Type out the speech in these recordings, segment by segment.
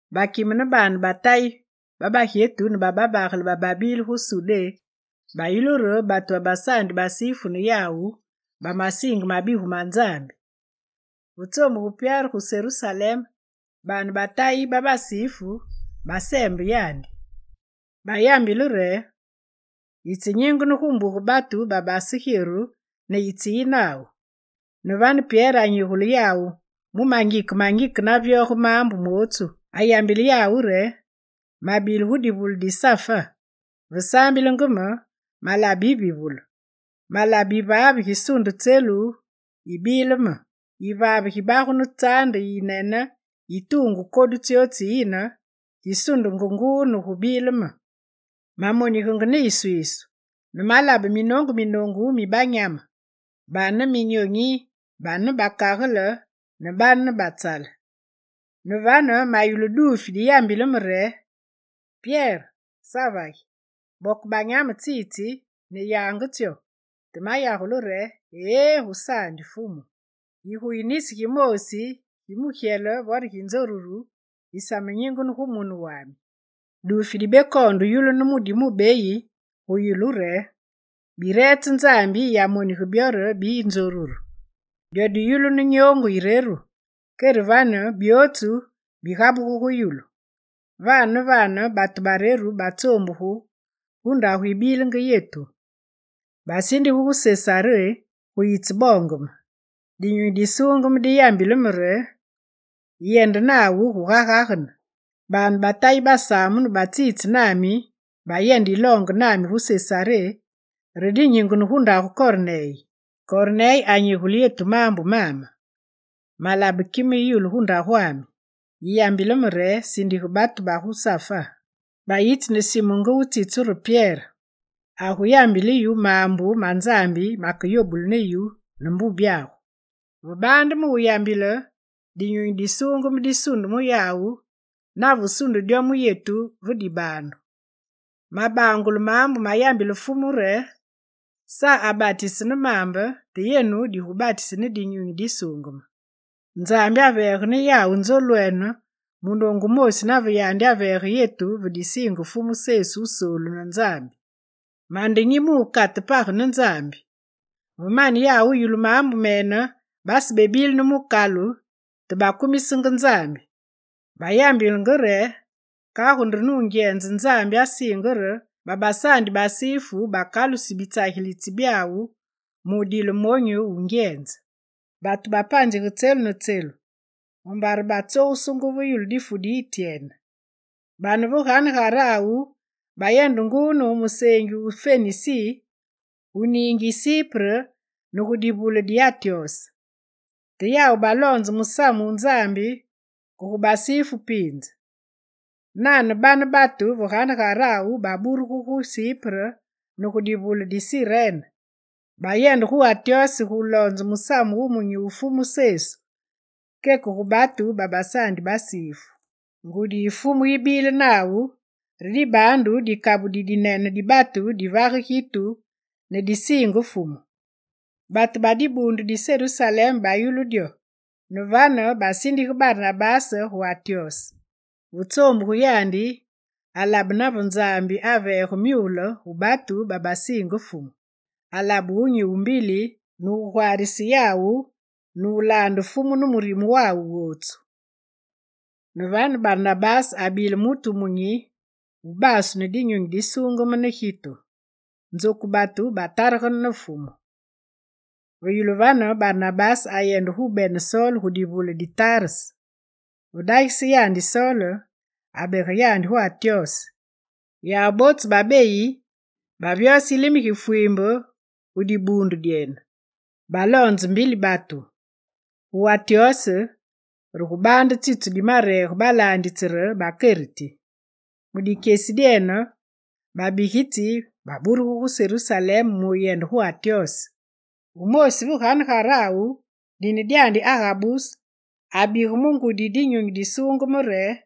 Bakime ne baane ba Tayi ba bagyetu ne ba babagele bababile gu Sudé bayulu re batu babasaandi basifu ne yawu bamasiinge mabigu ma Nzambi. Ve tsoombuge Pyere gu Serusalem, baane ba Tayi ba basifu baseembe yandi. Bayambile yandi re: «Yitse nyingene gu mbuge batu babasegyeru ne yitseyi nawu!» Ne vane Pyere anyigule yawu mu mangike mangike navyoge maambu mootsu. Ayambile yawu re: «Mabile gu divule di Safa. Ve saambilenge me, malabe yivivulu. Malabe yivaave gisundenge tselu yibile me: yivaave gibagunu tsaande yinene yi tuungu kodu tsyootsu tsiyine, gi sundenge nguu ne gubile me. Mamonigenge ne iswiisu ne malabe minoongu minoongu mi banyame: bane ne minyonyi, bane ne bakagele, ne bane ne batsale. Ne vane mayulu duufi diyambilenge me re: “Pyere, savagi! Boke banyame tsitsi ne yange tsyo!” Te mayagule re: “Eé gusaandi, Fumu! Yiguyi nisi gimoosi gi mugyele vo gi nzoruru gisamenyingene gu mune wami.” Duufi dibekoonde wuyulunu mu di mubeyi gu yulu re: “Bi reetse Nzambi yiyamonige byo re biyi nzoruru.” Dyo diyulunu nyoongu yireru, kere vane byootsu bigabugu gu yulu. Vane ne vane batu bareru batsoombugu gu ndagu yibilenge yetu. Basindugu gu Sesaré gu yitseboonge me. Dinyunyi Disuungeme diyambile me re: “Yendenge nawu guga gagene.” Baane ba Tayi basaamunu batsitse nami, bayende yiloonge nami gu Sesaré re dinyingene gu ndagu Korneye. Korneye anyigule yetu maambu mame: “Malabe kime yi yulu gu ndagwami. Yiyambile me re: Sindige batu gu Safa bayitsi ne Simu nge wutsitsu re Pyere. Aguyambile yu maambu ma Nzambi makeyobule ne yu ne mbubyagu.” Ve baande me wuyambile, Dinyunyi Disuungeme disunde mu yawu nave sunde dyo mu yetu ve dibaandu. Mabangule maambu mayambile Fumu re: “Sa abatise ne maambe. Te yenu digubatusu ne Dinyunyi Disuungeme.” Nzambi aveege ne yawu nzolwene munoongu wumoosi nave yandi aveege yetu ve disiinge Fumu Sesu Wusoolu ne Nzambi: mande nyi mu wukate bapage ne Nzambi?» Ve mane yawu wuyulu maambu mene, basebebile ne mukalu te bakumisenge Nzambi. Bayambilenge re: «Kagu nde nungyenze Nzambi asiinge re babasaandi basifu bakalusi bitsagilitsi byawu mu wudile monyu wungyenze.» Batu bapanzige tselu ne tselu, mumbare batsogusungu ve yulu difu di Ityene. Bane ve ganegarawu bayende nguu ne gu museengi wu Fenisi, gu niingi yi Sipre ne gu divule di Antyose. Te yawu baloonze musamu wu Nzambi ke gu basifu piinze. Nane bane batu ve ganegarawu baburugu gu Sipre ne gu divule di Sirene, bayende gu Antyose guloonze Musamu Wumunyi wu Fumu Sesu keke gu batu babasaandi basifu. Ngudi yi Fumu yibile nawu, re dibaandu dikabu didinene di batu divage gitu ne disiinge Fumu. Batu ba dibuundu di Serusalem bayulu dyo, ne vane basindige Barnabase gu Antyose. Ve tsoombugu yandi, alabe nave Nzambi aveege myule gu batu babasiinge Fumu. Alabe wunyi wumbili ne agwaarise yawu mulaande Fumu ne murime wawu wootsu. Ne vane Barnabase abile mutu wumunyi, wubaasu ne Dinyunyi Disuungeme ne gitu. Nzoku batu bataregene ne Fumu. Ve yulu vane, Barnabase ayende gubene Sol gu divule di Tarse. Ve dagise yandi Sol, abege yandi gu Antyose. Yawu bootsu babeyi bavyose yilime gi fwiimbe gu dibuundu dyene. Baloonze mbili batu. Gu Antyose re gubaande tsitsu dimareege balaanditsi re, bakeriti. Mu dikyesi dyene, babigitsi baburugu gu Serusalem mu wuyende gu Antyose. Wumoosi ve ganegarawu dine dyandi Agabus, abige mu ngudi Dinyunyi Disuungeme re,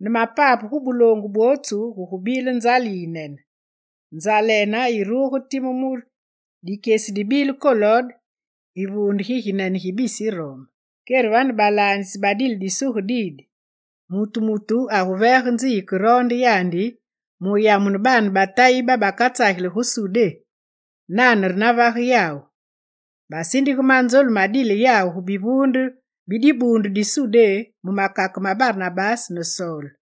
ne mapape gu buloongu bwootsu, gugubile nzale yinene. Nzalene yiruge time mu dikyesi dibile Kolode yivuunde gi ginene gi bisi Rome. Kere vane balaanditsi badile disuge didi: mutu mutu aguveege nzi yikeroonde yandi mu wuyamune baane ba Tayi babakatsageli gu Sudé. Nane re navage yawu. Basindige manzolu madile yawu gu bivuunde bi dibuundu di Sudé mu makake ma Barnabase ne Sol.